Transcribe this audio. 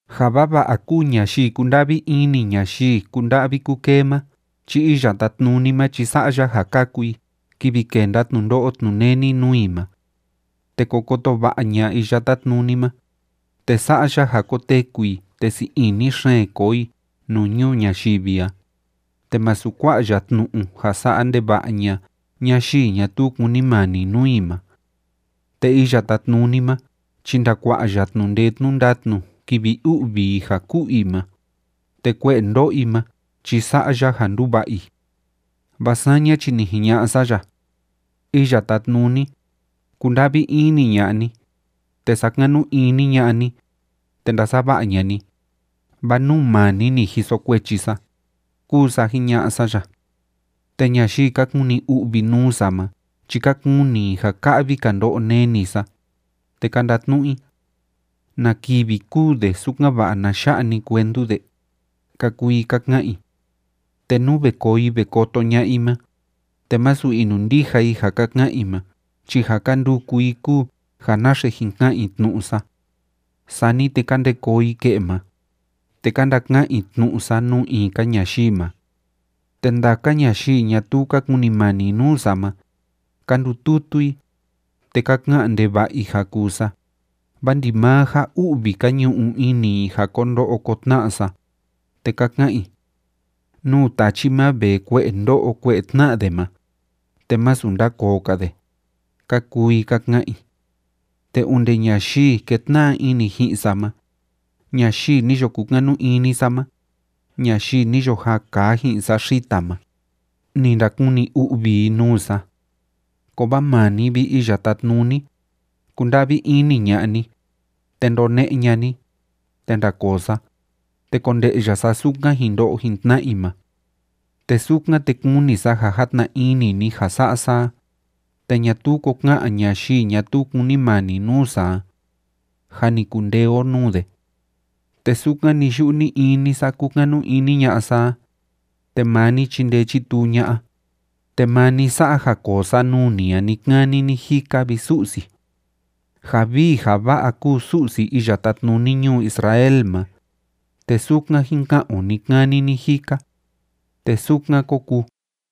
Ja vava'a kúu ñayii kúnda'vi ini ñayii kúnda'vi kúkee ma chi Iya Tátnuni ma chi sa'a ya ja kaku i kivi kenda tnundo'o tnuneni nuu i ma. Te ko koto va'a ña'a Iya Tátnuni ma, te sa'a ya ja koteku i te sii ini xeen koo i nuu ñuu ñayivi a, te másu kua'a ya tnu'u ja sa'a ndeva'a ña'a ñayii ñatuu kúnimani nuu i ma. Te Iya Tátnuni ma chi ndakua'a ya tnu'u ndee tnu'u ndatnu kivi u'vi i ja ku'u i ma, te kue'e ndo'o i ma chi sa'a ya ja nduva'a i. Vaa saña chi ni jiña'a sa ya: “Iya Tátnuni, kunda'vi ini ña'a ni, te sakanu ini ña'a ni, te ndasava'a ña'a ni, vaa nuu maa ni ni jiso kuechi sa”, kúu sa jiña'a sa ya. Te ñayii ka kuni u'vi nuu sa ma chi ka kuni i ja ka'vi‑ka ndo'o neni sa, te ka ndatnu'u i: “¿Na kivi kûu de sukan‑va'a na ya'a‑ni cuentu de?”, ka kuu i ka ka'an i. Te nú ve koo i ve koto ña'a i ma, te másu inundija i ja ka ka'an i ma chi ja ka nduku i kúu ja naxe jin ka'an i tnu'u sa. Sani te ka nde koo i ke'e ma, te ka ndaka'an i tnu'u sa nuu in‑ka ñayii ma. Te ndaka ñayii ñatuu ka kunimani nuu sa ma, ka ndututu i, te ka ka'an ndeva'a i ja kuu sa, vaa ndimaa ja u'vi ka ñu'u ini i ja ko ndo'o ko tna'a sa, te ka ka'an i: “Nuu tachi ma vee kue'e ndó'o kue'e tná'a de ma, te másu ndakoo‑ka de”, ka kuu i ka ka'an i. Te onde ñayii kétna'a ini ji'in sa ma, ñayii ni yo kukanu ini sa ma, ñayii ni yo jaa kaa ji'in sa xita ma, ni ndakuni u'vi i nuu sa. Kovaa maa ni, vi Iya Tátnuni, kunda'vi ini ña'a ni, te ndone'e ña'a ni, te ndakoo sa, te konde'ya sa sukan jin ndo'o tna i ma. Te sukan, te kuni sa ja játna ini ni ja sa'a sa a, te ñatuu ko ka'an ñayii ñatuu kúnimani nuu sa a: “Jâ ni kundee o nuu de.” Te sukan ni‑yu'u ni‑ini sa kúkanu ini ña'a sa a, te maa ni chindee chituu ña'a, te maa ni sa'a ja koo sa nuu ni a ni‑kani ni‑jika, vi Su'si. Ja vii ja va'a kúu Su'si iya tátnuni ñuu Israel ma, te sukan jín ka'an o ni‑kani ni‑jika. Te sukan kó kuu.